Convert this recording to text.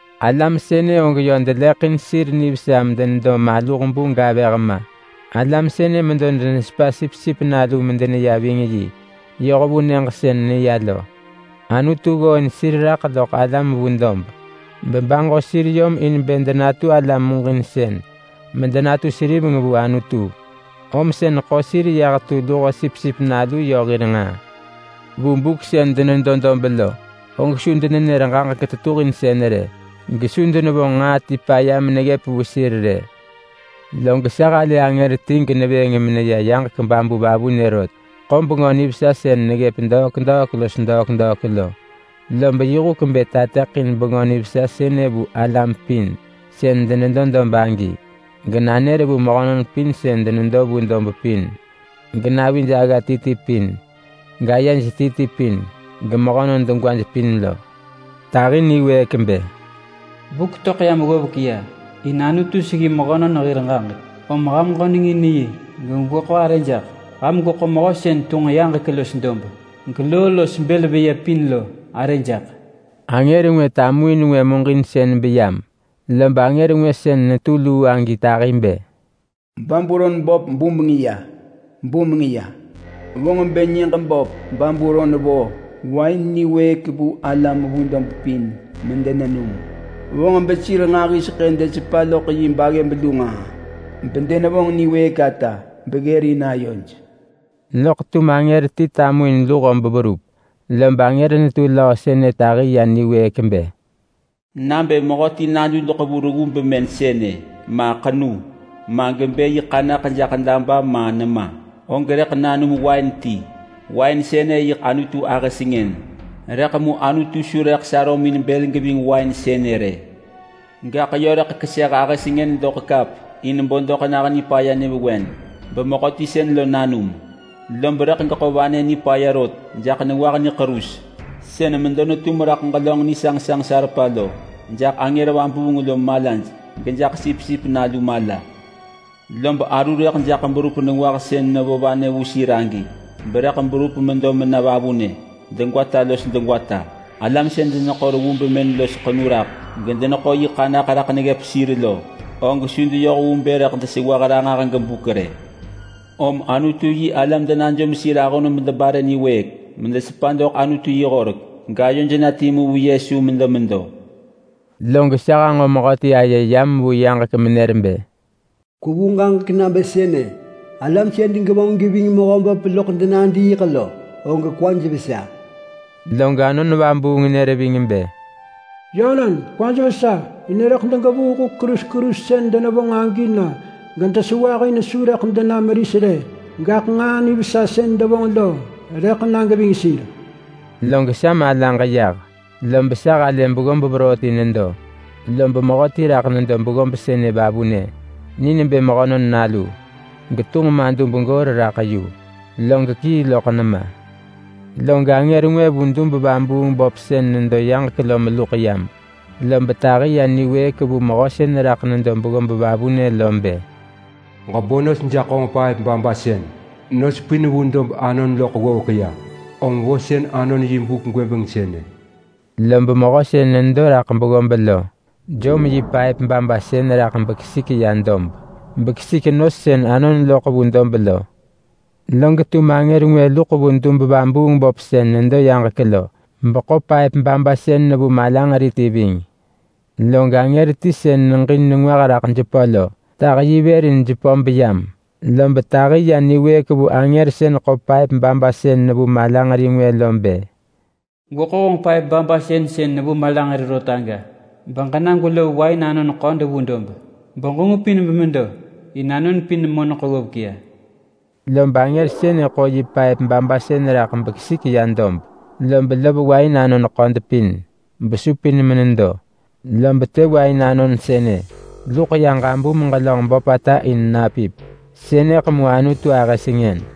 Alam sënë og yö deleḳin sir nivesa medenedo maluh bu gavëh ma. Alam sënë medo denesepa Sipsip Nalu medeneya ving yi yoh vu nyëġ sën neya lo. Anutu ggooin sir raḳ loḳ alam vu dob ayo vuheng gebaġo sir yom in bë denatu alam muġinsën medenatu seriveng vu Anutu, om sën ḳo sir yah tu luho Sipsip Nalu yö hir nġaa. Vu buk sën denedo dob lo, og su denenër ġaġek tetuhinsën rë, gesu denevonġ nġaa ti paya meneggëp vu sir rë. Log sa halë angër ti genevëëng meneya yaġek babu vavunë rot. Ḳo Bengö Nivesa sën neggëp degwata los degwata lo. Lob yi huk bë tateḳin Bengö Nivesa sënë vu alam pin sën denedo dob agi, genanër vu mehönon pin sën denedo vu dob pin, genavij agga ti ti pin, gayej ti ti pin, gemehönon degwaj pin lo. Tahi niwëëk bë, “Buk töḳ yam ggovek ya in Anutu seggi mehönon hir ġaġek. Om ham ġönengin yi gegweḳo arë jaḳ. Ham gweḳo Mehö sën tunġ yaġek los dob, geloo los bël veyë pin lo arë jaḳ.” Angër ngwë tamuin ngwë muġinsën beyam. Lob angër ngwë sën netu luu agi tahi bë, “Babulon böp bumeng ya! Bumeng ya! Vonġ bë nyëġ böp Babulon vo wain niwëëk vu alam vu dob pin medenenum. Vonġ besir nġahiseḳë desepa loḳ yi baggëb lu nġaa bedenevonġ niwëëk ata beggërin ayoj.” Loḳ tum angër ti tamuin luho beverup. Lob angër netu löö sënë tahi ya niwëëk bë, “Nabë mehöti nadudeḳ vu reggu bemën sënë ma ḳenu, ma gebë yi ḳanaḳ jaḳ daba ma nema, og rëḳ nanum wain ti. Wain sënë yiḳ Anutu ahë sengën, rëḳ mu Anutu su rëḳ sarömin bël geving wain sënë rë. Gaḳ yö rëḳ keseh ahë sengën doḳ kap in bo doḳ nah nipaya nyëvewen, bemehöti sën lo nanum. Lob rëḳ geḳo vanë nipaya rot jaḳ nengwah niḳerus sën medo netum raḳ ġelönġ nisanġsanġ salpa lo, jaḳ angër vabuung lo malaj, gejaḳ Sipsip Nalu mala. Lob aru rëḳ jaḳ berup nengwah sën nevo vanë vu sir agi, berëḳ berup medo mena vavunë degwata los degwata. Alam sën deneḳo reggu bemën los ḳenu raḳ, gedeneḳo yi ḳanaḳ raḳ neggëp sir lo, og su deyoh vu bë rëḳ desewah ranġah los buk rë.” Om Anutu-yi-alam denajom sir ahon medebare niwëëk, medesepa doḳ Anutu yi horek, gayoj na timu vu Yesu medemedo. Log sa hanġo mehöti aye yam vu yaġek menër bë, “Kwevu ġaġek nabë sënë: ‘Alam sën degevonġ geving Mehöböp loḳ denadiiḳ lo, og kwaj vesa!’” Log Anon Vabuung nër ving bë, “Yönon, kwaj vesa in rëḳ degevuu huk ḳerus ḳerus sën denevonġ agi na gedesewah. In su rëḳ dena meris rë, gaḳ nġaa nivesa sën devonġ lo rëḳ na geving sir.” Log sa malaġ yah, lob sa halë beggob veroo ti nedo, lob mehöti raḳ nedo beggob sënë vavunë. Ni nebë Mehönon Nalu, getunġ madub goor raḳ yu, log kii loḳ nema. Log angër ngwë vu dub-vabuung-böp sën nedo yaġek lo meluḳ yam. Lob tahi ya niwëëk vu mehö sën raḳ nedo beggob vavunë lo bë, “Ġebo nos jaḳ honġ paëp babasën! Nos pin vu dob anon loḳ ggovek ya! Om vosën anon yi buk gwëbeng sënë!” Lob mehö sën nedo raḳ beggob lo jom yi paëp babasën raḳ bekesik ya dob, bekesik nos sën anon loḳ vu dob lo. Log tum angër ngwë luḳ vu dub-vabuung-böp sën nedo yaġek lo, beḳo paëp babasën nevu malanġeri ti ving. Log angër ti sën neġin nengwah raḳ jepö lo tah yi vër in jepö beyam. Lob tahi ya niwëëk vu angër sën ḳo paëp babasën nevu malanġeri ngwë lo bë, “Gweḳo honġ paëp babasën sën nevu malanġeri rot aga, beġena gwelov wain anon ḳod vu dob, beġengupin bemedo! In anon pin moneḳ ggovek ya!” Lob angër sënë ḳo yi paëp babasën raḳ bekesik ya dob, lob lov wain anon ḳod pin besupin menedo. Lob të wain anon sënë luḳ ya ġabum ġelönġ böpata in napip. Sënëḳ mu Anutu ahë sengën.